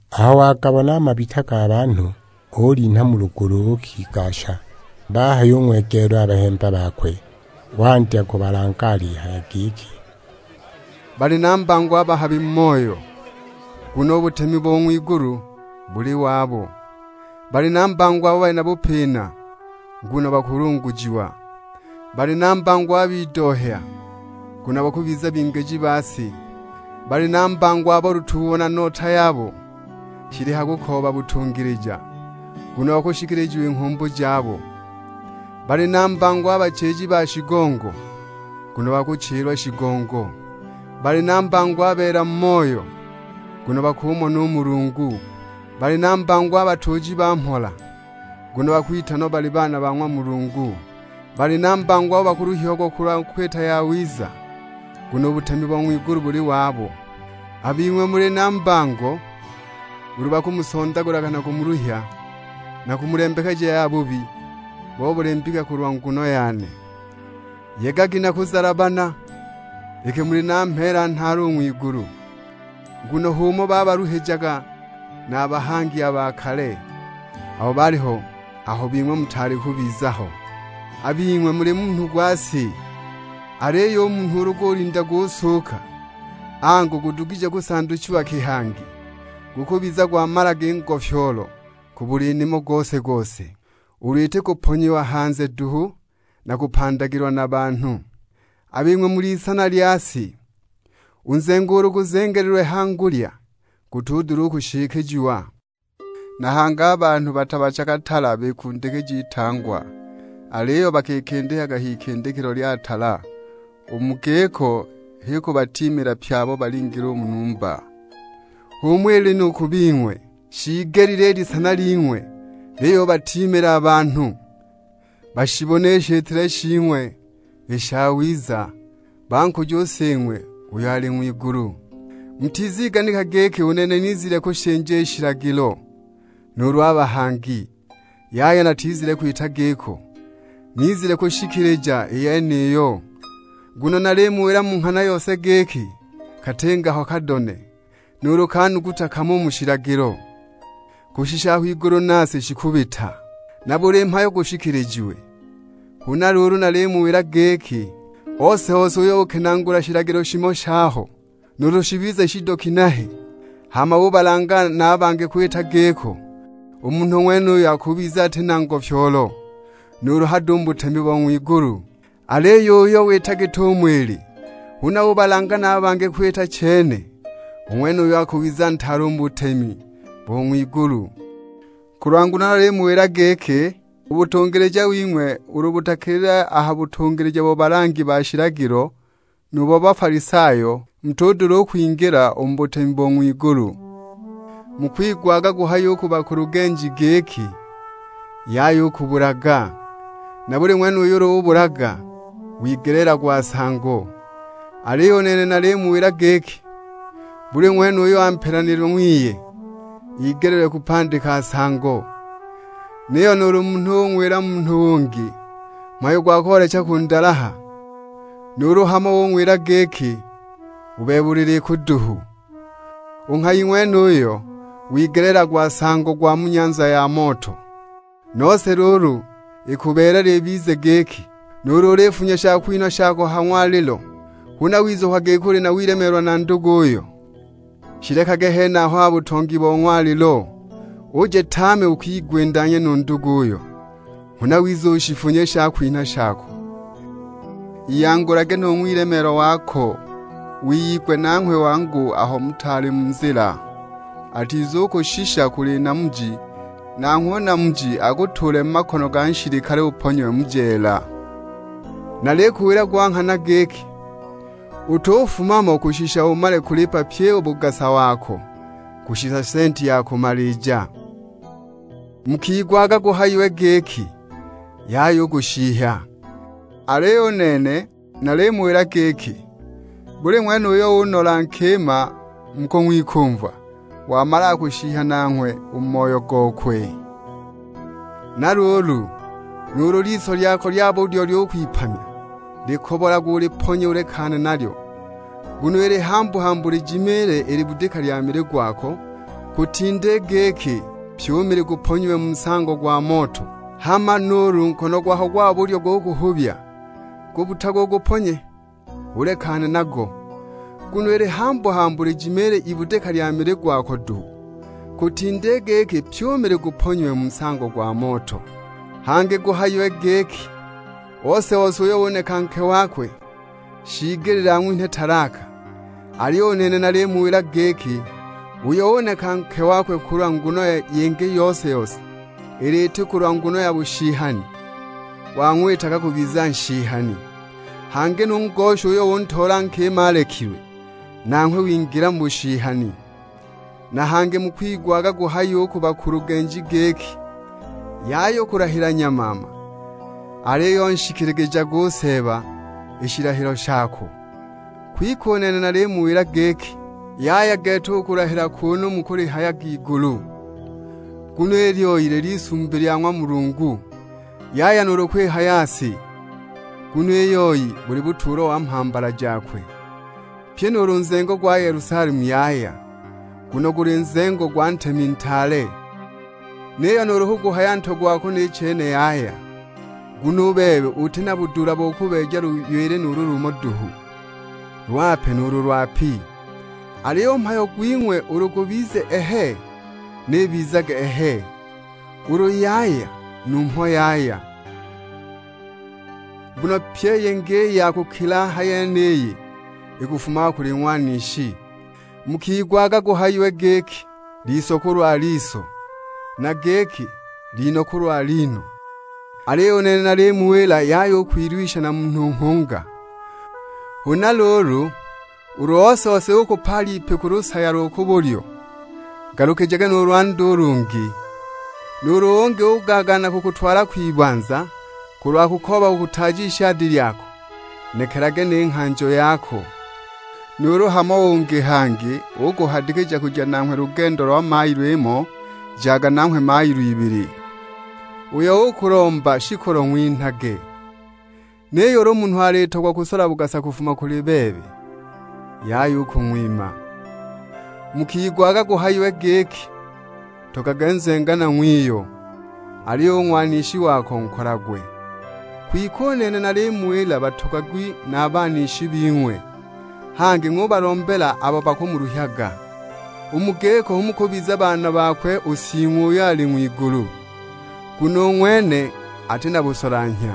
Aho wagabona a mabita ga banhu, ulinha mu lugulu uukigasha. Bahayung'wegeela a bahemba bakwe, wandya kubalanga alihaya giki, "Bali na mbango a bahabi mu moyo; nguno u butemi bo ng'wigulu buli wabo. Bali na mbango abo bali na bupina; nguno bakulungujiwa. Bali na mbango a bidohya; nguno bakubiza bingiji ba si. Bali na mbango abo lutuubo na nota yabo shili ha kukooba butungilija; nguno bakushikiligijiwa i nghumbu jabo. Bali na mbango a bachiji ba shigongo; nguno bakuchilwa shigongo. Bali na mbango a beela mu moyo; nguno bakumona u Mulungu. Bali na mbango a batuuji ba mhola; nguno bakwitanwa bali baana ba ng'wa Mulungu. Bali na mbango abo bakuluhiagwa kulwa kwita yawiza; nguno u butemi bo ng'wigulu buli wabo. "A bing'we muli na mbango ulu bakumusondagulaga na kumuluhya, na kumulembekeja ya bubi bo buli mbika kulwa nguno yane. Yegagi na kuzalabana, iki muli na mheela nhaale u ng'wigulu. Nguno h'umo babaluhijaga na a bahangi a ba kale, abo baaliho aho bing'we mutaali kubiza ho!" "A bing'we muli munhu gwa si, aliyo u munhu ulu gulinda gusuuka, angu gudugije kusanduchiwa ki hangi? Gukubiza gwamalaga i ngofyoolo ku buli nimo gose-gose, ulu iti kuponyiwa hanze duhu na kupandagilwa na banhu! A bing'we mul'isana lya si, u nzengo ulu guzengelilwe ha ngulya gutudula kushikijiwa. Na hangi a banhu batabachaga tala bikundikija itangwa, aliyo bakikindikaga h'ikindikilo lya tala; u mu giko h'ikubatiimila pye abo balimo u mu numba. H'umo ili nu ku bing'we, shiigelile i lisana ling'we liyubatiimila a banhu, bashibone i shitile shing'we i shawiza, bankuje u Sing'we uyo ali ng'wigulu." "Mutiziganika giki u nene nizile kushinja i shilagilo nuulu a bahangi. Yaya natizile kwita giko, nizile kwishikilija i yeniyo. Nguno nalimuwila mu nghana yose giki, katinga ho kadone nuulu ka nuguta kamo u mu shilagilo, kushisha aho igulu na si shikubita, na buli mhayo gushikilijiwe. Huna luulu nalimuwila giki, ose-ose uyo ukenaagula shilagilo shimo shaho, nuulu shibize shido na ginehe, hama ubalanga na bangi kwita giko, u munhu ng'wenuyo akubiza ati na ngofyoolo nuulu hado u mu butemi bo ng'wigulu. Aliyo uyo wita git'umo ili, huna ubalanga na bangi kwita chene; u ng'wenuyo akubiza ntaale u mu butemi bo ng'wigulu. Kulwa nguno nalimuwila giki, u butungilija wing'we ulu butakilile a ha butungilija bo balangi ba shilagilo nu bo Bafalisayo, mutudula u kwingila u mu butemi bo ng'wigulu. "Mukigwaga guhayiwe u ku bakulugenji giki, 'Yaya u kubulaga; na buli ng'wene uyo ubulaga wigeleelagwa nsango.' Aliyo u nene nalimuwila giki, buli ng'wene uyo ampelanilile ng'wiye igeleelilwe kupandika nsango. Niyo nuulu munhu ung'wila munhu ungi mhayo gwa koolecha kundalaha, u ng'wenuyo nanghwe shing'wigeleelilwe kushishiwa kwibanza. Nuulu hamo ung'wila giki, 'U bebe uli likuduhu.' U nghayi ng'wenuyo wigeleelagwa nsango gwa mu nyanza ya moto! Nose luulu ikubeelela ibize giki, nuulu ulifunya shakwinha shako ha ng'walilo, huna wizukwa giki uli na wilemeelwa na nduguyo, shilekage henaho ha butongi bo ng'walilo, uje tame ukigwindanye nu nduguyo, huna wize ushifunye i shakwinha shako. Iyangulage nu ng'wilemeelwa wako, wiyigwe nanghwe wangu aho mutaali mu nzila. Atizukushisha kuli namuji, nanghwe u namuji akutuule mu makono ga nshilikale uponyiwe mu jeela. Nalikuwila gwa nghana giki, utufuma mo kushisha umale u kulipa pyi u bugasa wako; kushisha senti ya kumalija!" "Mukigwaga guhayiwe giki, 'Yaya u kushihya.' Aliyo u nene nalimuwila giki, buli ng'wene uyo unola nkima mu kung'wikumva, wamalaga kushihya nanghwe u mu moyo gokwe. Na luulu, nuulu liso lyako lya ku bulyo lyukwipamya likobolage uliponye ulekane nalyo, nguno ili hambu-hambu lijimiile ibudika lya mili gwako, kutinda i giki pyi u mili guponyiwe mu nsango gwa moto. Hama nuulu nkono gwako gwa bulyo gukuhubya, gubbutage uguponye, ulekane nago; nguno ili hambu-hambu lijimiile ibudika lya mili gwako duhu, kutinda i giki pyi u mili guponyiwe mu nsango gwa moto!" "Hangi guhayiwe giki, 'Ose-ose uyo uneka nke wakwe shiigelile ang'winhe talaka.' Aliyo u nene nalimuwila giki, uyo uneka nke wakwe kulwa nguno yingi yose-yose, ulu iti kulwa nguno ya bushihani, wang'witaga kubiza nshihani; hangi nu ngosha uyo untoola nkima alekilwe, nanghwe wingilaga mu bushihani." "Na hangi mukigwaga guhayiwe u ku bakulugenji giki, 'Yaya u kulahila nyamaama, aliyo nshikiligijage u Seeba i shilahilo shako.' Kwike u nene nalimuwila giki, yaya gete u kulahila kunu mukulihayaga igulu, nguno i lyoi lil'isumbi lya ng'wa Mulungu. Yaya nuulu kwihaya si, nguno i yoi ili butuulo wa mhambala jakwe; pyi nuulu nzengo gwa Yelusalemu yaya, nguno guli nzengo gwa Ntemi ntaale. Niyo nuulu kuguhaya ntwe gwako ni chene yaya; nguno u bebe uti na budula bo kubeeja luywili nuulu lumo duhu, lwape nuulu lwapi! Aliyo u mhayo gwing'we ulu gubiza 'Ehe,' ni ibizage 'Ehe.' Ulu 'Yaya,' numho 'Yaya.' Nguno pyi i yingi i ya kukila a ha yeniyi, ikafumaga kuli ng'wanishi!" "Mukigwaga guhayiwe giki, 'Liso kulwa liso,' na giki, 'Lino kulwa lino!' Aliyo u nene nalimuwila yaya u kwilwisha na munhu nghunga; huna luulu ulu ose-ose ukupaala ipi ku lusaya lo ku bulyo, ngalukijage nu lwandi u lungi! Nuulu ungi ugaagaana kukutwala kwibanza kulwa kukooba kukutaaja ishadi lyako, nekelage ni nghanjo yako. Nuulu hamo ungi hangi ukuhadikija kuja nanghwe lugendo lwa mailo imo, jaga nanghwe mailo ibili. Uyo ukulomba shikolo ng'winhage, niyo ulu munhu alitogwa kusola bugasa kufuma kuli bebe, yaya u kung'wima." "Mukigwaga guhayiwe giki, 'Ntogagwe nzenganwa ng'wiyo, aliyo u ng'wanishi wako nkolagwe!' Kwike u nene nalimuwila batogagwi na a banishi bing'we, hangi ng'ubalombela abo bakumuluhyaga. U mu giko hu mukubiza baana bakwe u Sing'we uyo ali ng'wigulu. Nguno u ng'wene ati na busolanhya,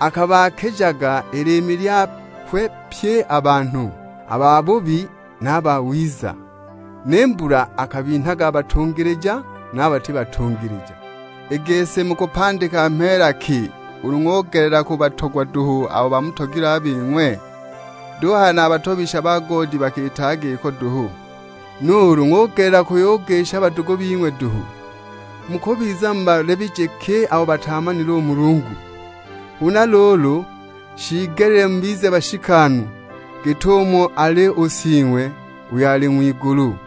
akabaakijaga i liimi lyakwe pye a banhu, a babubi na a bawiza; ni mbula akabinhaga a batungilija na a bati batungilija. I gisi mukupandika mheela ki ulu ng'ugelela kubatogwa duhu abo bamutogilwe a bing'we? Duhaya na a batobisha ba goodi bakiitaga giko duhu! Nuulu ng'ugelela kuyugisha badugu bing'we duhu, mukubiza mubalebije ki abo bataamanile Mulungu? Huna luulu, shiigelile mubize bashikanu git'umo ali u Sing'we uyo ali ng'wigulu."